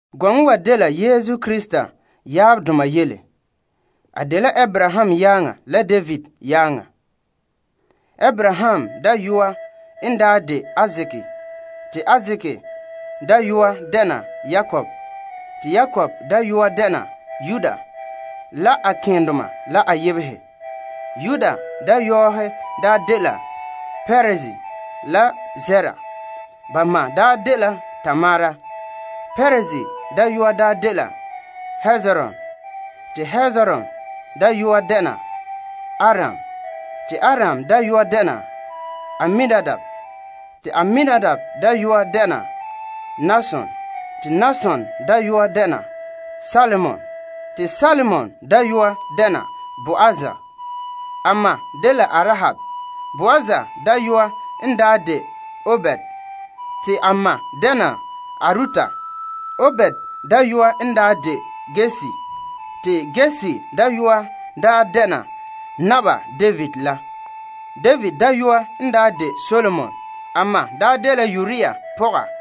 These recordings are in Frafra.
Gɔŋɔ wa dela Yesu Krista tuunhom. A dela Abraham yaaŋa la David yaaŋa. Abraham dayɔa n daa de Isaak, te Isaak dayɔa dɛna Yakob, te Yakob dayɔa dɛna Yuda la a keendoma la a yebehe. Yuda dayɔɔhe daa dela Perez la Zera. Ba ma daa dela Tamar. Perez dayɔa dela Hezron, te Hezron dayɔa dɛna Aram, te Aram dayɔa dɛna Aminadab, te Aminadab dayɔa dɛna Nason, te Nason dayɔa dɛna Salmon, te Salmon dayɔa dɛna Boaz. A ma dela Arahab. Boaz dayɔa n de Obed. Te a ma dɛna Arut. Obed dayɔa n de Yesse, te Yesse dayɔa dɛna Naba David la. David dayɔa n de Solomon se'em te a ma dela Uria pɔga.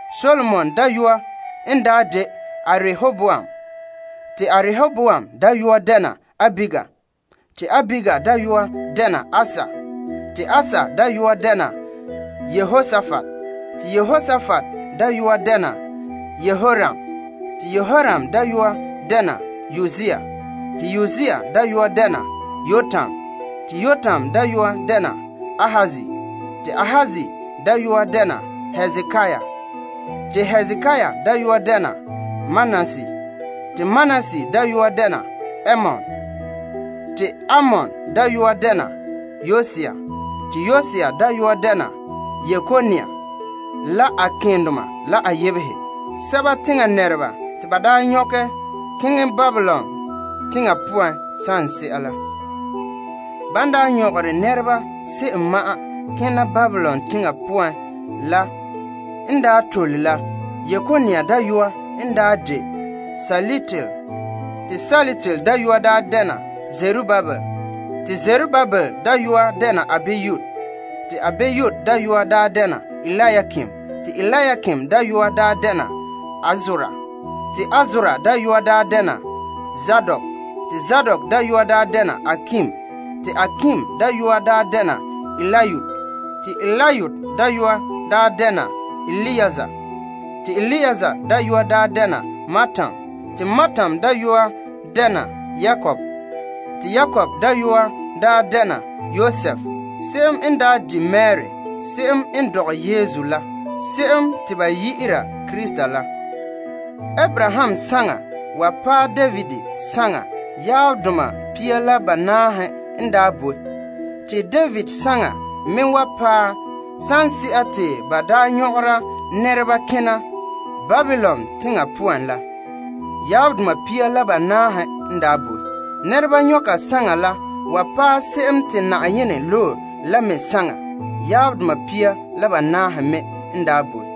Solomon dayɔa n daa de Arehoboam, te Arehoboam dayɔa dɛna Abiya, te Abiya dayɔa dɛna Asa, te Asa dayɔa dɛna Yehosapat te Yehosapat dayɔa dɛna Yoram, te Yoram dayɔa dɛna Uzia, te Uzia dayɔa dɛna Yotam, te Yotam dayɔa dɛna Ahaz, te Ahaz dayɔa dɛna Hezekia, te Hezekia dayɔa dɛna Manase, te Manase dayɔa dɛna Amon te Amon dayɔa dɛna Yosia, te Yosia dayɔa dɛna Yekonia la a keendoma la a yebehe, sɛba teŋa nɛreba te ba daa nyɔkɛ keŋɛ Babilon teŋa poan saŋse'a la. Ban daa nyɔgere nɛreba se'em ma'an kena Babilon teŋa poan la n daa tole la Yekonia dayɔa n daa de Sealtiel, te Sealtiel dayɔa dɛna Zerubabel, te Zerubabel dayɔa dɛna Abiud, te Abiud dayɔa dɛna Eliakim, te Eliakim dayɔa dɛna Azor, te Azor dayɔa dɛna Zadok, te Zadok dayɔa dɛna Akim, te Akim dayɔa dɛna Eliud, te Eliud dayɔa dɛna Eleazar, te Eleazar dayɔa dɛna Mattan, te Mattan dayɔa dɛna Yakob, te Yakob dayɔa dɛna Yosef, se'em n di' Mari, se'em n dɔgɛ Yesu la, se'em te ba yi'ira Krista la. Abraham saŋa wa paɛ David saŋa yaabdoma pia la banaahe n daa boe. Te David saŋa me wa paɛ saŋse'a te ba daa nyɔgera nɛreba kena Babilon teŋa poan la, yaabdoma pia la banaahe n daa boe. Nɛreba nyɔnka saŋa la wa paɛ se'em te Na'ayenɛ loe la me saŋa, yaabdoma pia la banaahe me n daa boe.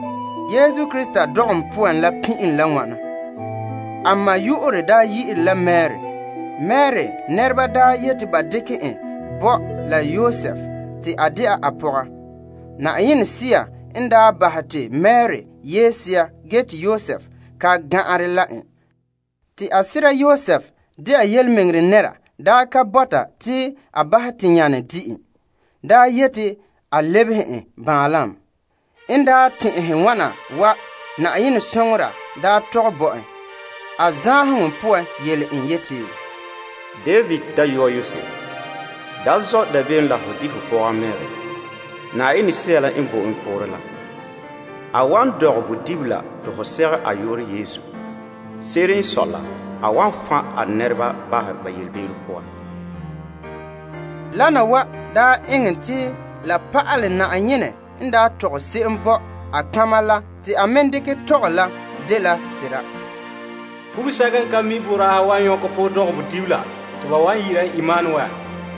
Yesu Krista dɔgɔm poan la daa pin'ilom la wana. A ma yu'urɛ dela Mari. Mari nɛreba yeti ba dekɛ en bo la Yosef te a dɛna a pɔga. Yenɛ Sea n bahɛ te Mari yee sea ge te Yosef ka naɛ la en. Te a sera Yosef dɛna tontɔɔdaana daa ka bɔta te a bahɛ te nyanɛ di' en, daa yeti a lebehe en baanlam. En tɛn'ɛhe wana wa, Na'ayenɛ soŋora tɔgɛ bo en a zaanheŋɔ poan yele en yeti, David dayɔa Yosef, da zɔ' dabeem la ho di' ho pɔga Mari. Bisɛka te ka tara la dela Yenɛ Sea la paŋa poan. A wan dɔgɛ bodibila te ho segɛ a yu'urɛ Yesu. Se'ere n sɔe la a wan fan' a nɛreba bahɛ ba yelebe'ero poan. Wana wa daa eŋɛ te la pa'alɛ Na'ayenɛ n tɔgɛ se'em bo a nɔtɔgɔha la te a me dekɛ tɔgɛ la dela sera, Pɔgɔsa'a kanherɛ wan nyɔkɛ poorɛ dɔgɛ bodibila, segɛ ka yu'urɛ Emanuel.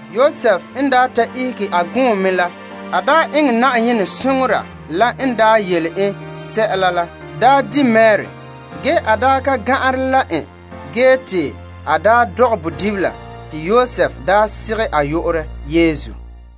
Yosef n daa ta ihege a gɔɔme la, a eŋɛ Na'ayenɛ soŋora la n yele en sɛla la, di' Mari, ge ka nɛ ka soŋen, ge te a dɔgɛ bodibila la. Te Yosef segɛ a yu'urɛ Yesu.